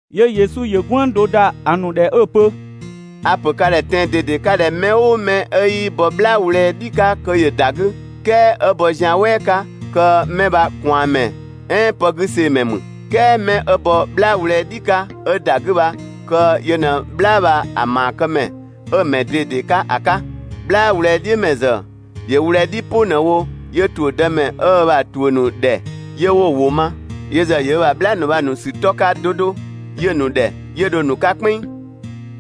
'Yö Yesu ‑yö "gwënng do ‑da ‑a ‑nu ‑dhɛ 'ö‑ pö: «A‑ ‑pö ka ‑dhɛ tɛan‑ ꞊dede 'ka ꞊dhɛ mɛ "ʋʋ mɛ 'ö 'yii bɔ "bhlaa wlɛɛ "dhi 'ka kö ‑yö ‑da 'gü, "kɛɛ 'ö bɔ zian "wɛɛ 'ka, kö 'mɛ bha ꞊kwaanmɛ "ɛɛn pëgüseemɛ ‑mü. "Kɛɛ 'mɛ 'ö bɔ "bhlaa wlɛɛ "dhi 'ka 'ö ‑da 'gü bha kö yö ꞊në "bhlaa bha‑ ‑maakëmɛ 'ö‑ ‑mɛ ꞊dede 'ka ‑a 'ka. "Bhlaa wlɛɛ "dhiʋ̈mɛ ‑zë ‑yö wlɛɛ "dhi "pʋ ꞊në‑ wo 'yö ‑tuʋ̈ dëmɛ 'ö ö ‑bha ‑tuʋ̈ ‑nu ‑dhɛ, 'yö 'wo‑ ‑wʋ ma. Yö ‑zë ‑yö ö ‑bha "bhlaa ‑nu bha‑ ‑nu ‑sü 'tɔ 'ka 'do 'do 'yö‑ ‑nu ‑dhɛ, 'yö dho‑ ‑nu 'ka "kpɛnng.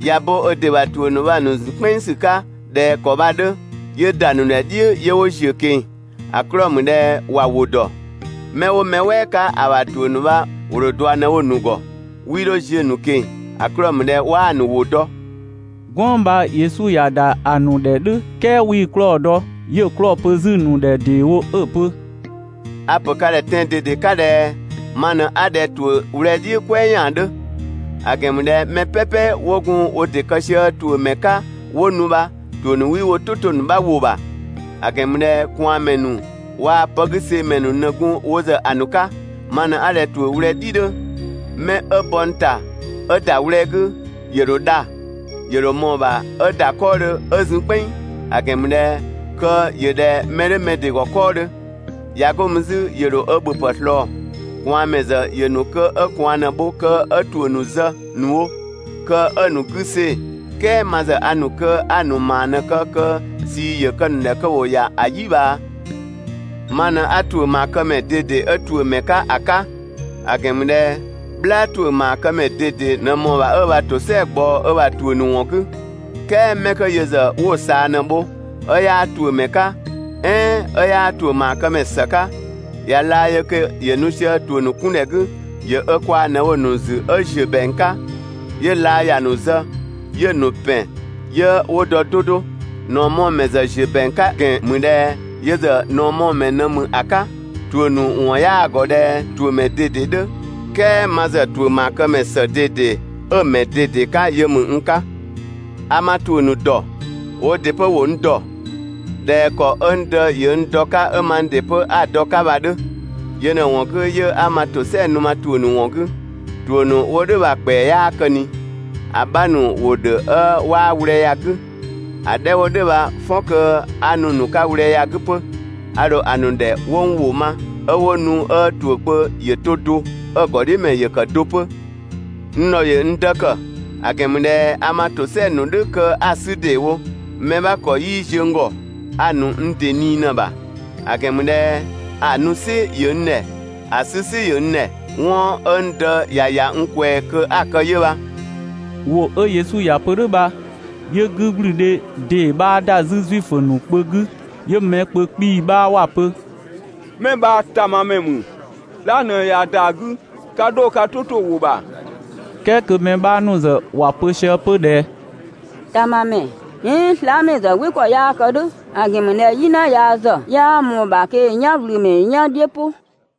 ꞊Ya bo ö ‑dɩ ‑bha ‑tuʋ̈ ‑nu bha‑ ‑nu ‑zun "kpɛnng ‑sü 'ka ꞊dhɛ ‑kɔ bha‑ 'dhö, 'yö ‑da ‑nu ‑dhɛ "dhiʋ̈ 'yö 'wo ‑ziö ꞊keng‑, ‑a 'klɔɔ‑ ‑mü ꞊dhɛ ‑wa ‑wʋ ‑dɔ. 'Mɛ 'wo mɛ "wɛɛ 'ka ‑a ‑bha ‑tuʋ̈ ‑nu bha ‑wo ‑dho ꞊dua ꞊në‑ wo‑ ‑nu ‑gɔ, 'wii 'dho ziö‑ ‑nu ꞊keng‑, ‑a 'klɔɔ‑ ‑mü ꞊dhɛ 'waa‑ ‑nu ‑wʋ dɔ.» "Gwënng bha Yesu ‑ya ‑da ‑a ‑nu ‑dhɛ "dhʋ̈ "kɛɛ 'wii‑ 'klɔɔ‑ dɔ. 'Yö‑ 'klɔɔ‑ pö 'zü‑ ‑nu ‑dhɛ ‑deewo 'ö‑ pö: «A‑ ‑pö ka ‑dhɛ tɛan‑ ꞊dede 'ka ꞊dhɛ: Ma ꞊në 'a ꞊dhɛ ‑tuʋ̈ wlɛɛ "dhiʋ̈ "kwɛɛ ‑yaan 'dhö; ‑a ‑gɛn ‑mü ꞊dhɛ mɛ "pɛpɛ 'wo gun wo ‑dɩ kë sië ‑tuʋ̈ ‑mɛ 'ka 'wo nu bha, ‑tuʋ̈ ‑nu 'wii wo "tʋ 'to‑ 'bha ‑wʋ ‑bha. ‑A ‑gɛn ‑mü ꞊dhɛ ꞊kwaanmɛ ‑nu waa‑ pëgüseemɛ ‑nu ꞊në gun wo ‑zë ‑a ‑nu 'ka. Ma ꞊në 'a ꞊dhɛ ‑tuʋ̈ wlɛɛ "dhi 'dhö. 'Mɛ 'ö bɔ n ‑ta 'ö ‑da wlɛɛ 'gü, ‑yö ‑dho dha, ‑yö ‑dho ꞊mɔɔ‑ ‑bha 'ö ‑da 'kɔɔdhö 'ö zun "kpɛnng, (‑a ‑gɛn ‑mü ꞊dhɛ kö ‑yö ꞊dhɛ mɛ 'dhö mɛ ‑dɩ ‑gɔ 'kɔɔdhö). ꞊Ya 'go mü 'zü ‑yö ‑dho ö ‑bhöpë ꞊slɔɔ. ꞊Kwaanmɛ ‑zë ‑yö ‑nu kö 'ö ꞊kwaan ꞊në‑ bho kö 'ö ‑tuʋ̈ ‑nu zë ‑nu wo kö 'ö‑ ‑nu 'gü see‑, "kɛɛ ma ‑zë a ‑nu kö 'a‑ ‑nu ‑maa ꞊në‑ kë kö ꞊sii ‑yö kë‑ ‑nu ‑dhɛ kö ‑wo ‑ya ‑a "yi ꞊bhaa. Ma ꞊në 'a ‑tuʋ̈ ‑maakëmɛ ꞊dede 'ö ‑tuʋ̈mɛ 'ka ‑a 'ka. ‑A ‑gɛn ‑mü ꞊dhɛ "bhlaa ‑tuʋ̈ ‑maakëmɛ ꞊dede ꞊në ꞊mɔɔ‑ ‑bha 'ö ö ‑bha ‑tosɛa ꞊gbaɔ ö ‑bha ‑tuʋ̈ ‑nu ‑wɔn 'gü; "kɛɛ 'mɛ 'kö yö ‑zë 'wo‑ ꞊saa ꞊në‑ bho, 'ö 'yaa ‑tuʋ̈mɛ 'ka, "ɛɛn 'ö 'yaa ‑tuʋ̈ ‑maakëmɛ ‑së 'ka, ꞊ya laa yö kö ‑yö nu sië ‑tuʋ̈ 'kun ‑dhɛ 'gü, ‑yö ö kwaa‑ ꞊në‑ wo‑ ‑nu zü 'ö ‑ziö ‑bɛang 'ka, 'yö laa ‑ya nu zë, 'yö‑ ‑nu ‑pɛn 'yö 'wo dɔ 'do 'do. ꞊Naɔmɔɔmɛ ‑zë ‑ziö ‑bɛang 'ka ‑gɛn ‑mü ꞊dhɛ yö ‑zë ꞊naɔmɔɔmɛ ꞊në ‑mü ‑a 'ka, ‑tuʋ̈ ‑nu ‑wɔn 'yaa‑ ‑gɔ ‑dhɛ ‑tuʋ̈mɛ ꞊dede 'dhö, "kɛɛ ma ‑zë ‑tuʋ̈ ‑maakëmɛ ‑së ꞊dede 'ö‑ 'ka yö ‑mü n 'ka. A ma ‑tuʋ̈ ‑nu ‑dɔ, woo ‑dɩ 'pö 'wo n dɔ. ꞊Dhɛ ‑kɔ 'ö n Dë ‑yö n dɔ‑ 'ka 'ö mang ‑dɩ 'pö 'a‑ dɔ‑ bha‑ 'dhö. Yö ꞊në‑ ‑wɔn 'gü 'yö 'a ma ‑tosɛa nu ma ‑tuʋ̈ ‑nu ‑wɔn 'gü. ‑Tuʋ̈ ‑nu 'wo "dhʋ̈ bha‑ ‑kpɛa 'yaa kë ꞊ni, ‑a 'bha ‑nu ‑wo ‑dhö 'ö 'waa wlɛɛ ya‑ 'gü. ‑A 'dhɛ 'wo "dhʋ̈ bha "fɔn kö 'a nu‑ ‑nu 'ka wlɛɛ ya‑ 'gü 'pö. A ‑dho ‑a ‑nu ‑dhɛ 'wo n ‑wʋ ma, 'ö 'wo nu 'ö ‑tuʋ̈ kpö ‑yö to do, 'ö‑ ‑gɔdhiʋ̈mɛ ‑yö ‑kë do 'pö. N ‑dhɔ ‑yö n Dë ‑kë, ‑a ‑gɛn ‑mü ꞊dhɛ a ma ‑tosɛa ‑nu "dhʋ̈ kö 'a‑ 'sü ‑deewo. Mɛ 'bha ‑kɔ 'yii ziö n ‑gɔ, a‑ ‑nu n ‑dɩ ꞊nii ꞊në‑ ‑bha. ‑A ‑gɛn ‑mü ꞊dhɛ ‑a nu "sɩ ‑yö n ‑dhɛ, ‑a 'sü "sɩ ‑yö n ‑dhɛ. 'Wɔn 'ö n Dë ‑ya ‑ya n ꞊kwɛɛ‑ kö 'a‑ kë 'yö bha.» ‑Wʋ 'ö Yesu ‑ya pö "dhʋ̈ bha 'yö 'gügblüdhe ‑dee 'bha ‑da 'zü Zuifö ‑nu kpö 'gü. 'Yö mɛ kpö 'kpii‑ 'bha ‑wa pö: «'Mɛ bha ‑tamamɛ ‑mü!» "ɛɛn: «Slaa" ꞊në ꞊ya ‑da 'gü, 'ka 'dho ka "tʋ 'to‑ ‑wʋ ‑bha!» "Kɛɛ kö mɛ 'bha ‑nu ‑zë ‑wa pö sië 'pö ꞊dhɛ: «‑Tamamɛ "ɛɛn slaamɛ ‑zë "wɩ ‑kɔ 'yaa kë "dhʋ̈, ‑a ‑gɛn ‑mü ꞊dhɛ "yina yaa ‑zë 'yaa ꞊mɔɔ‑ ‑bha kö ‑yö "yanwlümɛ "yan "dhiʋ̈ "pʋ.»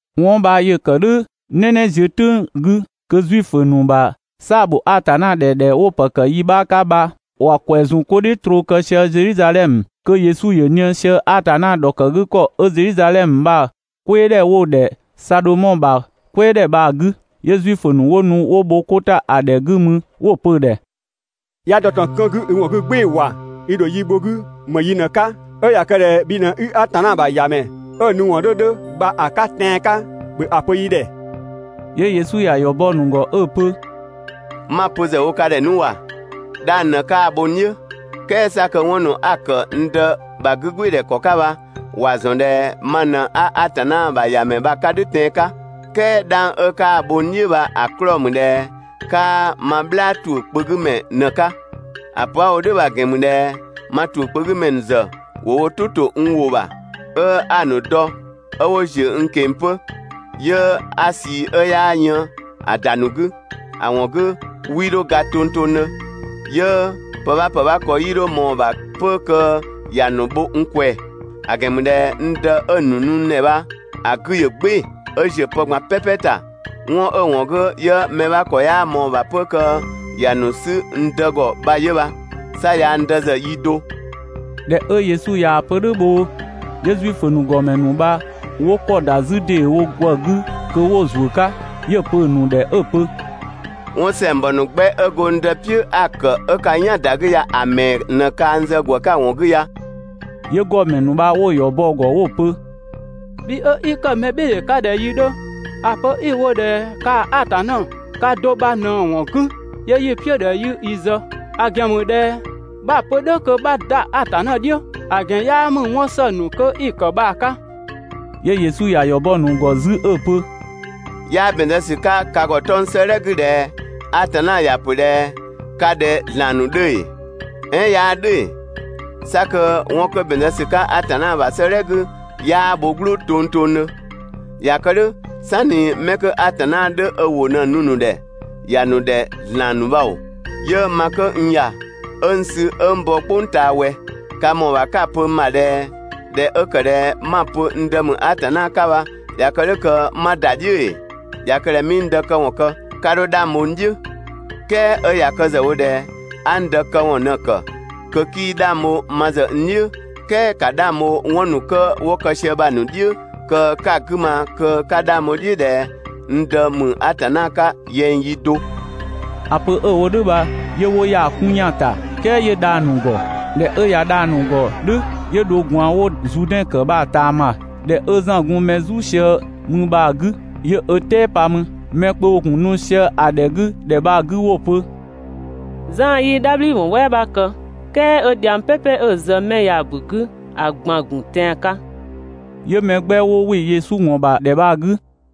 'Wɔn bha ‑yö ‑kë "dhʋ̈ "nɛnɛ ziö "tʋ̈ng 'gü kö Zuifö ‑nu ‑bha "saa‑ ‑bho Atanna ‑dhɛ ‑dhɛ 'wo‑ ‑pë ‑kë yi 'bha 'ka bha ‑wa ‑kwɛ ‑zun 'ko "dhiʋ̈ troo kë sië Zedhizadhɛmö. Kö Yesu ‑yö ꞊nië sië Atanna ‑dhɔkëgükɔ 'ö Zedhizadhɛmö bha‑ "kwɛɛdhɛ 'wo‑ ‑dhɛ Sadhomɔ ‑bha "kwɛɛdhɛ bha‑ 'gü, 'yö Zuifö ‑nu 'wo nu 'wo bho 'ko ‑ta ‑a ‑dhɛ 'gü mü 'wo‑ pö‑ ‑dhɛ: «'Ya dɔ ꞊tɔn 'kën 'gü i ‑wɔn 'gü "gbɩɩ‑ ‑wa, i ‑dho yi bho‑ 'gü ‑më yi ꞊në‑ 'ka? 'Ö ꞊ya kë ꞊dhɛ bhi ꞊në 'i Atanna ‑bha ‑Yamɛ 'ö‑ nu ‑wɔn 'dhö 'dhö bha‑ 'ka tɛan‑ 'ka, ‑bhö ‑a pö yi ‑dhɛ!» 'Yö Yesu ‑ya ‑yɔ bɔ‑ ‑nu ‑gɔ 'ö‑ pö: «'Ma‑ pö ‑zë wo ka ‑dhɛ 'nu ‑wa, 'dhang ꞊në 'kaa‑ bho n "dhiʋ̈. "Kɛɛ 'sa kö 'wɔn ‑nu 'a‑ ‑kë n Dë ‑bha 'gügbɩɩdhɛ ‑kɔ 'ka bha ‑wa ‑zɔn ꞊dhɛ ma ꞊në 'a Atanna ‑bha ‑Yamɛ bha‑ 'ka "dhʋ̈ tɛan‑ 'ka. "Kɛɛ 'dhang 'ö 'kaa‑ bho n "dhiʋ̈ bha‑ 'klɔɔ‑ ‑mü ꞊dhɛ 'kaa ma "bhlaa ‑tuʋ̈ kpö 'gü ‑mɛ ꞊në‑ 'ka. ‑A pö 'a‑ wo "dhʋ̈ bha‑ ‑gɛn ‑mü ꞊dhɛ ma ‑tuʋ̈ kpö 'gü ‑mɛ ‑nu ‑zë ‑wo wo "tʋ ‑to n ‑wʋ ‑bha, 'ö 'a‑ ‑nu dɔ, 'ö 'wo ‑ziö n ꞊keng‑ 'pö, 'yö 'a ꞊sii 'ö 'yaa yën‑ ‑da ‑nu 'gü. ‑A ‑wɔn 'gü 'wii 'dho ga tongtongdhö, 'yö pë 'bha ‑pë 'bha ‑kɔ 'yii 'dho ꞊mɔɔ‑ ‑bha 'pö kö ‑ya ‑nu bho n ꞊kwɛɛ‑. ‑A ‑gɛn ‑mü ꞊dhɛ n Dë 'ö‑ ‑nu nu n ‑dhɛ bha‑ 'gü ‑yö "gbɩɩ‑ 'ö ‑ziö pë ꞊gban "pɛpɛ ‑ta. 'Wɔn 'ö‑ ‑wɔn 'gü 'yö mɛ 'bha ‑kɔ 'yaa ꞊mɔɔ‑ ‑bha 'pö kö ‑ya ‑nu 'sü n Dë ‑gɔ bha 'yö bha. 'Sa yaa‑ n Dë ‑zë yi do.» ꞊Dhɛ 'ö Yesu ‑ya pö "dhʋ̈ bhoo, 'yö Zuifö ‑nu ‑gɔmɛ ‑nu bha 'wo ‑kɔ ‑da 'zü ‑deewo ‑gwë 'gü kö 'wo‑ ‑zuö 'ka. 'Yö‑ pö‑ ‑nu ‑dhɛ 'ö‑ pö: «'Wɔn ‑sɛngbɔ ‑nu 'gbɛ 'ö go n Dë "piʋ̈ 'a‑ ‑kë 'ö ka "yan‑ ‑da 'gü ya‑ ‑mɛɛ ꞊në kaa n zë ‑gwë 'ka‑ ‑wɔn 'gü ya?» 'Yö ‑gɔmɛ ‑nu bha 'wo‑ ‑yɔ bɔ‑ ‑gɔ 'wo‑ pö: «Bhi 'ö 'i ‑kë mɛbhɩɩdhe 'ka ꞊dhɛ yi 'dhö ‑a pö 'i‑ wo ꞊dhɛ kaa‑ Atanna ka do bha ꞊në‑ ‑wɔn 'gü 'yö 'yi‑ "piʋ̈ ꞊dhɛ 'yi i zë, ‑a ‑gɛn ‑mü ꞊dhɛ 'bha‑ pö "dhʋ̈ kö 'bha ‑da Atanna "dhiʋ̈. ‑A ‑gɛn 'yaa ‑mü 'wɔn ‑së ‑nu 'kö 'i‑ ‑kë bha‑ 'ka!» 'Yö Yesu ‑ya ‑yɔ bɔ‑ ‑nu ‑gɔ 'zü 'ö‑ pö: «'Yaa ‑bɛn zë ‑sü 'ka ka ‑gɔ 'tɔng‑ 'sëëdhɛ 'gü ꞊dhɛ: ‹Atanna ‑ya ‑pö ꞊dhɛ: Ka ꞊dhɛ ‑zlan ‑nu 'dhö› ‑ee? "Ɛɛn 'yaa "dhʋ̈ ‑ee? 'Sa kö 'wɔn 'kö ‑bɛn zë ‑sü 'ka Atanna ‑bha 'sëëdhɛ 'gü 'yaa bho "gblʋʋ tongtongdhö. ꞊Ya kë "dhʋ̈, "sanni 'mɛ 'kö Atanna 'dhö ö ‑wʋ ꞊në‑ nu‑ ‑nu ‑dhɛ ‑ya ‑nu ‑dhɛ ‑zlan ‑nu bha ‑oo, 'yö ma 'kö n ‑ya, 'ö n sü 'ö n bɔ "kpʋng ꞊taa ꞊wɛ? Ka ‑mɔɔ ‑bha 'ka‑ pö n ‑bha ꞊dhɛ ꞊dhɛ 'ö ‑kë ꞊dhɛ 'ma‑ pö n Dë ‑mü Atanna 'ka bha ꞊ya kë "dhʋ̈ kö 'ma ‑da "dhiʋ̈ ‑ee? ꞊Ya kë ꞊dhɛ 'mii n Dë këwɔn kë, 'ka 'dho 'dhang bho n "dhiʋ̈. "Kɛɛ 'ö ꞊ya kë ‑zë wo ꞊dhɛ a n Dë këwɔn ꞊në‑ ‑kë, 'kö 'kii 'dhang bho ma ‑zë n "dhiʋ̈, "kɛɛ ‑ka 'dhang bho 'wɔn ‑nu 'kö 'wo kë sië bha‑ ‑nu "dhiʋ̈ kö 'ka‑ 'gü ma kö 'ka 'dhang bho‑ "dhiʋ̈ ꞊dhɛ n Dë ‑mü Atanna 'ka, yɛng yi do.» ‑A pö 'ö‑ wo "dhʋ̈ bha 'yö 'wo ‑ya 'kun ‑yan ‑ta, "kɛɛ 'yö dha‑ ‑nu ‑gɔ. ꞊Dhɛ 'ö dha‑ ‑nu ‑gɔ "dhʋ̈, 'yö dho ꞊gwaan 'wo‑ Zuudɛn ‑kë bha‑ ꞊taama, ‑dhɛ 'ö Zan gun mɛ "zu sië mü bha‑ 'gü 'yö ö "tɛɛ pa mü. Mɛ kpö ‑wo ‑gun nu sië‑ ‑dhɛ 'gü ‑dhɛ bha‑ 'gü 'wo‑ pö: «Zan 'yii "dhabhliwɔn "wɛɛ 'bha kë, "kɛɛ 'ö dhiang "pɛpɛ 'ö‑ zë 'mɛ 'ö ya‑ ‑bu 'gü ‑a ꞊gban ‑gun tɛan‑ 'ka.» 'Yö mɛ 'gbɛ 'wo ‑wɩ Yesu ‑wɔn ‑bha ‑dhɛ bha‑ 'gü.